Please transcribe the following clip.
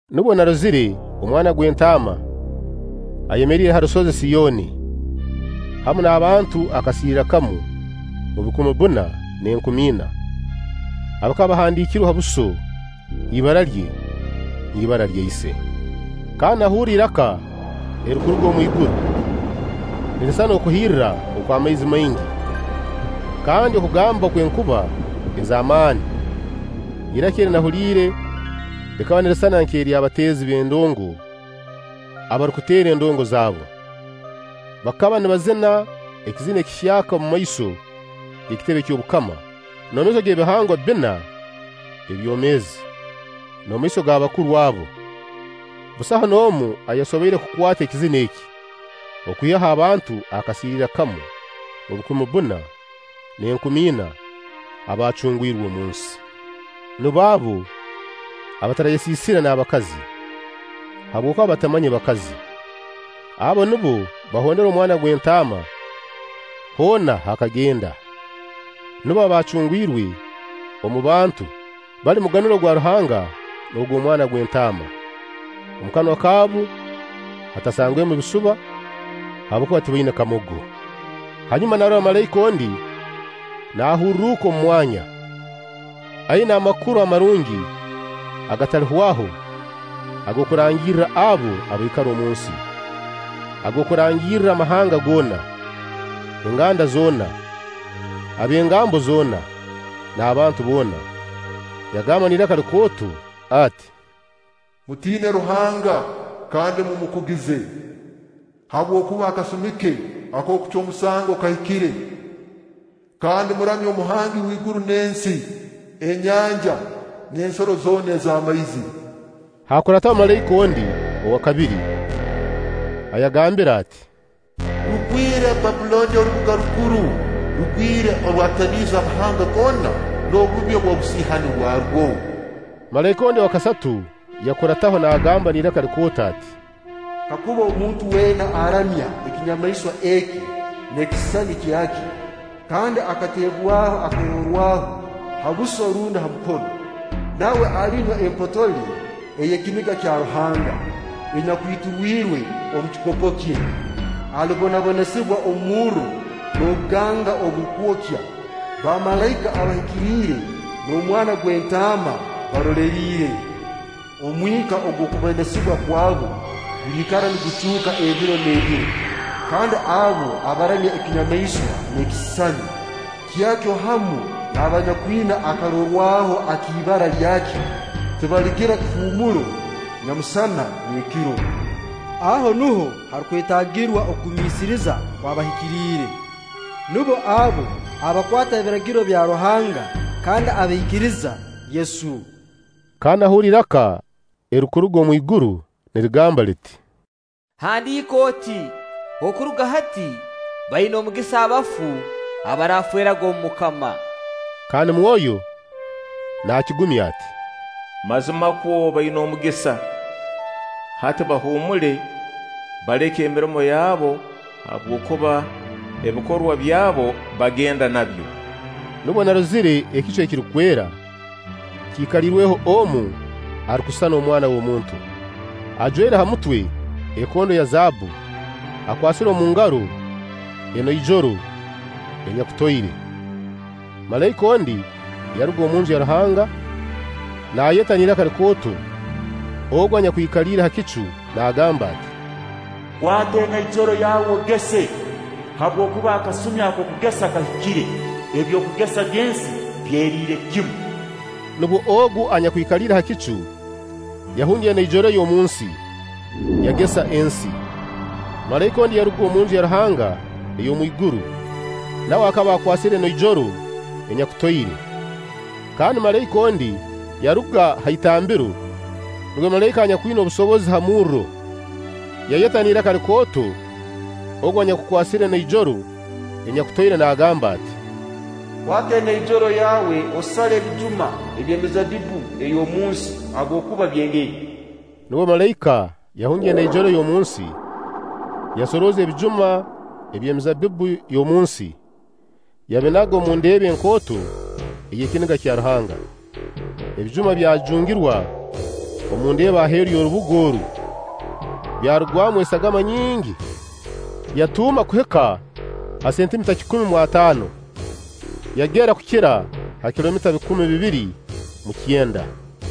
Nubwo narozire Omwana gw'Entaama ayemeriire ha rusozi Siyoni, hamu n'abantu akasiiriira kamu mu bukumi bbuna n'enkumi ina, abakaba bahandiikirwe ha buso ibara lye n'ibara lya Ise. Kandi nahurra iraka erirukuruga omwiguru, nirisisana okuhirra okw'amaizi maingi kandi okugamba okw'enkuba ez'amaani. Iraka eri nahuliire likaba nirisisana nk'ery'abateezi b'endongo abarukuteera endongo zaabbu, bakaba nibazina ekizina ekihyaka omumaiso g'ekitebe ky'obukama, n'omu maiso g'ebihangwa bbina ebyomeezi, n'omu maiso g'abakuru abo. Busaho n'omu ayasoboire kukwata ekizina eki, okwihaho abantu akasiiriira kamu mu bukumi bbuna n'enkumi ina abaacungwirwe omunsi. Nubo abo abatarayesiisire n'abakazi, habwokuba batamanye bakazi; abo nubo bahondera Omwana gw'Entaama hoona h'akagenda; nubo abaacungwirwe omu bantu, bali munganuro gwa Ruhanga n'ogw'Omwana gw'Entaama. Omu kanwa kaabu hatasangwemu bisuba, habwokuba tibaina kamogo. Hanyuma narora malaika ondi naahurruka omu mwanya, aina Amakuru Amarungi agatalihwaho ag'okurangirra abo abaikara omunsi, ag'okurangirra amahanga goona, enganda zoona, ab'engambo zoona, n'abantu boona; yagamba n'iraka likooto ati: “Mutiine Ruhanga kandi mumukugize, habwokuba akasumi ke ak'okucwa omusango kahikire; kandi muramye Omuhangi w'iguru n'ensi, enyanja n'ensoro zoona z'amaizi.” Haakurataho malaika ondi, owa kabiri, ayagaambire ati: “Rugwire Bbabbulooni orubuga rukuru! Rugwire oru orwatamiize amahanga goona n'obubi obw'obusiihani bwarwo!” Malaika ondi owa kasatu yabakurataho naagamba n'iraka likooto ati: “Kakuba omuntu weena aramya ekinyamaiswa eki n'ekisisani kyakyo, kandi akateebwaho akarorwaho ha buso rundi ha mukono, nawe alinywa empotole ey'ekiniga kya Ruhanga, enyakwiturwirwe omu kikopo kye. Alibonabonesibwa omurro n'obuganga oburukwokya, bamalaika abahikiriire n'Omwana gw'Entaama baroleriire. Omwika ogw'okubonesibwa kwabo guliikara nigucuuka ebiro n'ebiro; kandi abo abaramya ekinyamaiswa n'ekisisani, kyakyo hamu n'abanyakwina akarorwaho ak'ibara lyakyo, tibaligira kihuumuro nyamusana n'ekiro.” Aho nuho harukwetaagirwa okugumiisiriza kw'abahikiriire. Nubo abo abakwata Ebiragiro bya Ruhangga kandi abaikiriza Yesu. Kandi nahurra iraka erirukuruga omu iguru nirigamba liti: “Handiika oti: Okuruga hati, baina omugisa abafu abaraafeeraga omu MUKAMA.” Kandi Mwoyo naakigumya ati: “Mazimakwo baina omugisa, hati bahuumule, baleke emirimo yabu, habwokuba ebikorwa byabu bagenda nabyo!” Nubwo narozire ekicu ekirukwera, kiikaliirweho omu arukusisana omwana w'omuntu, ajwaire ha mutwe ekondo ya zaabbu, akwasire omu ngaro enoijoro enyakutoire. Malaika ondi yaruga omu Nju ya Ruhanga naayeta n'iraka likooto Ogu anyakwikaliire ha kicu naagamba ati: “Kwata enoijoro yawe ogese, habwokuba akasumi ak'okugesa kahikire, ebyokugesa by'ensi byeriire kimu.” Nubwo Ogu anyakwikaliire ha kicu yahungya enoijoro ye omunsi, yagesa ensi. Malaika ondi yaruga omu Nju ya Ruhanga ey'omwiguru, nawe akaba akwasire enoijoro enyakutoire. Kandi malaika ondi yaruga ha itambiro, nuwe malaika anyakwina obusobozi ha murro, yayera n'iraka likooto Ogu anyakukwasire enoijoro enyakutoire naagamba ati: “Kwata enoijoro yawe osale ebijuma by'emizabbibbu ey'omunsi habwokuba byengere.” Nubwo malaika yahungya enoijoro ye omunsi, yasoroza ebijuma by'emizaabbibbu y'omunsi, yabinaga omu ndeeba enkooto ey'ekiniga kya Ruhanga. Ebijuma byajungirwa omu ndeeba aheeru y'orubuga oru, byarugwamu esagama nyingi, yatuuma kuhika ha sentimita kikumi mu ataano, yagera kukira ha kilomita bikumi bibiri mu kyenda.